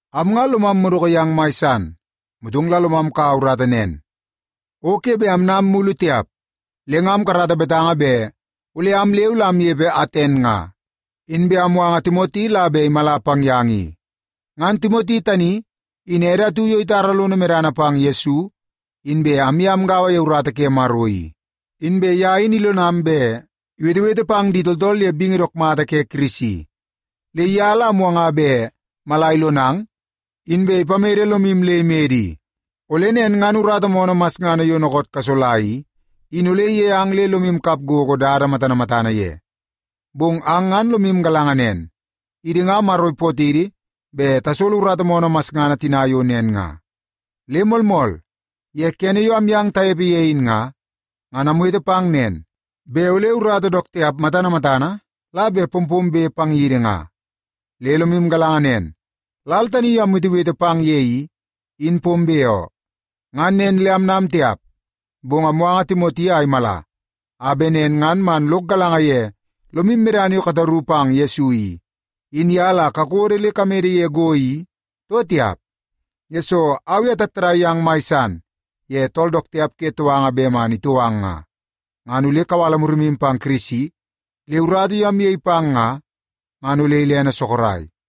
Am nga lomam madoko yang mai san, motong la lomam kaua urata nen, o ke bet amnam mulu tiap. Le nga amkarata betanga bet ole am leu la amnepe Aten nga, inbe amwanga Timoti la bet imala pang yang i. Ngan Timoti tani, in ede atu yo itara lono medana pang Yesu, inbe amye amgaua ye urata ke Maro i. Inbe ye in ilonam bet iwetewete pang di tooltool ye bingi dook mata ke Kirisi. Le ye la amwanga bet mala ilonang, inbe ipamede lomu le imede i. Ole nen ngan urata moonoo masngana yo dookoot kasola i, in ole iyei ang le lomu kap gogo dada matana matana ye. Bong ang ngan lomu galanga nen, idi nga Maro ipootidi bet tasolo urata moonoo masngana tina yo nen nga. Le moolmool, ye kene yo amyang tanepe ye in nga, ngan amwete pang nen, bet ole urata dook tiap matana matana la bet pompombe pang yidi nga. Le lomu galanga nen, lal tani yo amwetewete pang ye i, in pombe oo. Ngan nen le anam tiap. Bong awanga Timoti a imala, a bet nen ngan man lok galanga ye lomu medana yo kataru pang Yesu i, in ye la kakodo le kamede ye go i, too tiap. Yesoo au i atattadai yang mai san ye tool dook tiap ke touanga bet man itou ang nga, ngan ole kawala murimu pang Kirisi, le urata yo amyei pang nga, ngan ole ilene sorok.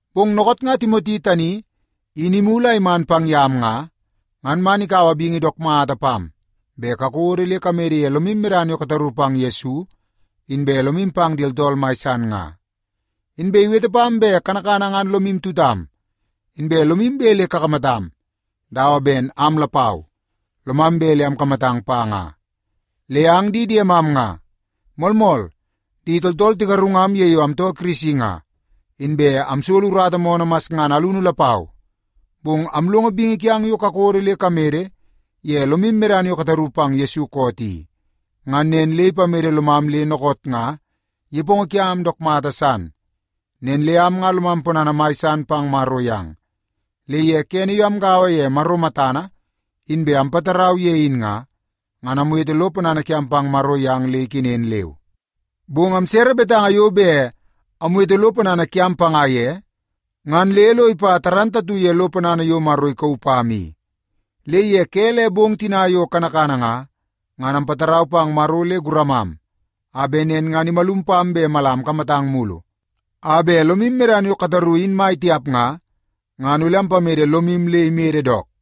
Bong dookoot nga Timoti tani in imulu a iman pang yam nga, ngan man ikaua bingi dook mata pam bet kakodo le kamede ye lomu medana yo kataru pang Yesu inbe lomu pang di tooltool mai san nga. Inbe iwete pam bet kanakana ngan lomu tutam, inbe lomu bet le kakamatam, dawa ben am lapau, lomam bet le akamatang pa nga. Le ang di diemam nga, moolmool, di tooltool tigarungam ye yo amtoo Kirisi nga, inbe amsolo urata moonoo masngana alunu lapau. Bong amlongo bingi kiang yo kakodo le kamede ye lomu medana yo kataru pang Yesu koot i, ngan nen le ipamede lomam le dookoot nga nepongo kiam dook mata san. Nen le am nga lomam ponana mai san pang Maro yang. Le ye kene yo amgaua ye Maro matana inbe ampatarau ye in nga, ngan amwete lo ponana kiam pang Maro yang le ikenen leu. Bong amsere betanga yo bet amwete lo ponana kiam panga ye, ngan le lo ipa dook mata ye lo ponana yo Maro ikauu pam i. Le ye ke le bong tina yo kanakana nga, ngan ampatarau pang Maro le guramam, a bet nen ngan imalum pam bet mala amkamatang mulu, a bet lomu medana yo kataru in mai tiap nga, ngan ole ampamede lomu le imede dook.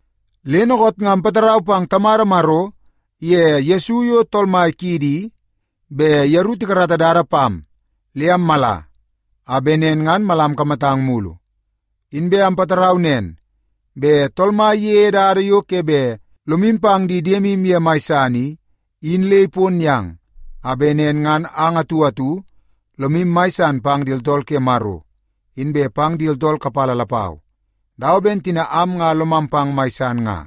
Le dookoot nga ampatarau pang Tamada Maro iye Yesu yo Tool Mai kiidi i, bet yeru tikarata dada pam le ammala a bet nen ngan mala amkamatang mulu. Inbe ampatarau nen, bet Tool Mai iyeie dada yo ke bet lomu pang di diemu ye mai san i, in le ipon yang, a bet nen ngan ang atu atu lomu mai san pang di tooltool ke Maro, inbe pang di tooltool kapala lapau, dawa ben tina am nga lomam pang mai san nga.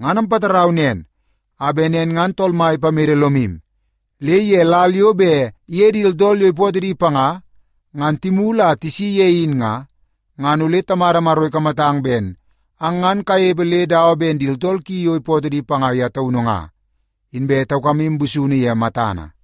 Ngan ampatarau nen a bet nen ngan Tool Mai ipamede lomu, le ye lal yo bet iye di tooltool yo ipootoo di panga, ngan timulu a tisi ye in nga, ngan ole Tamada Maro ikamatang ben ang ngan kanepe le dawa ben di tooltool ki yo ipootoo di panga ye taunu nga, inbe taukamu busunu ye matana.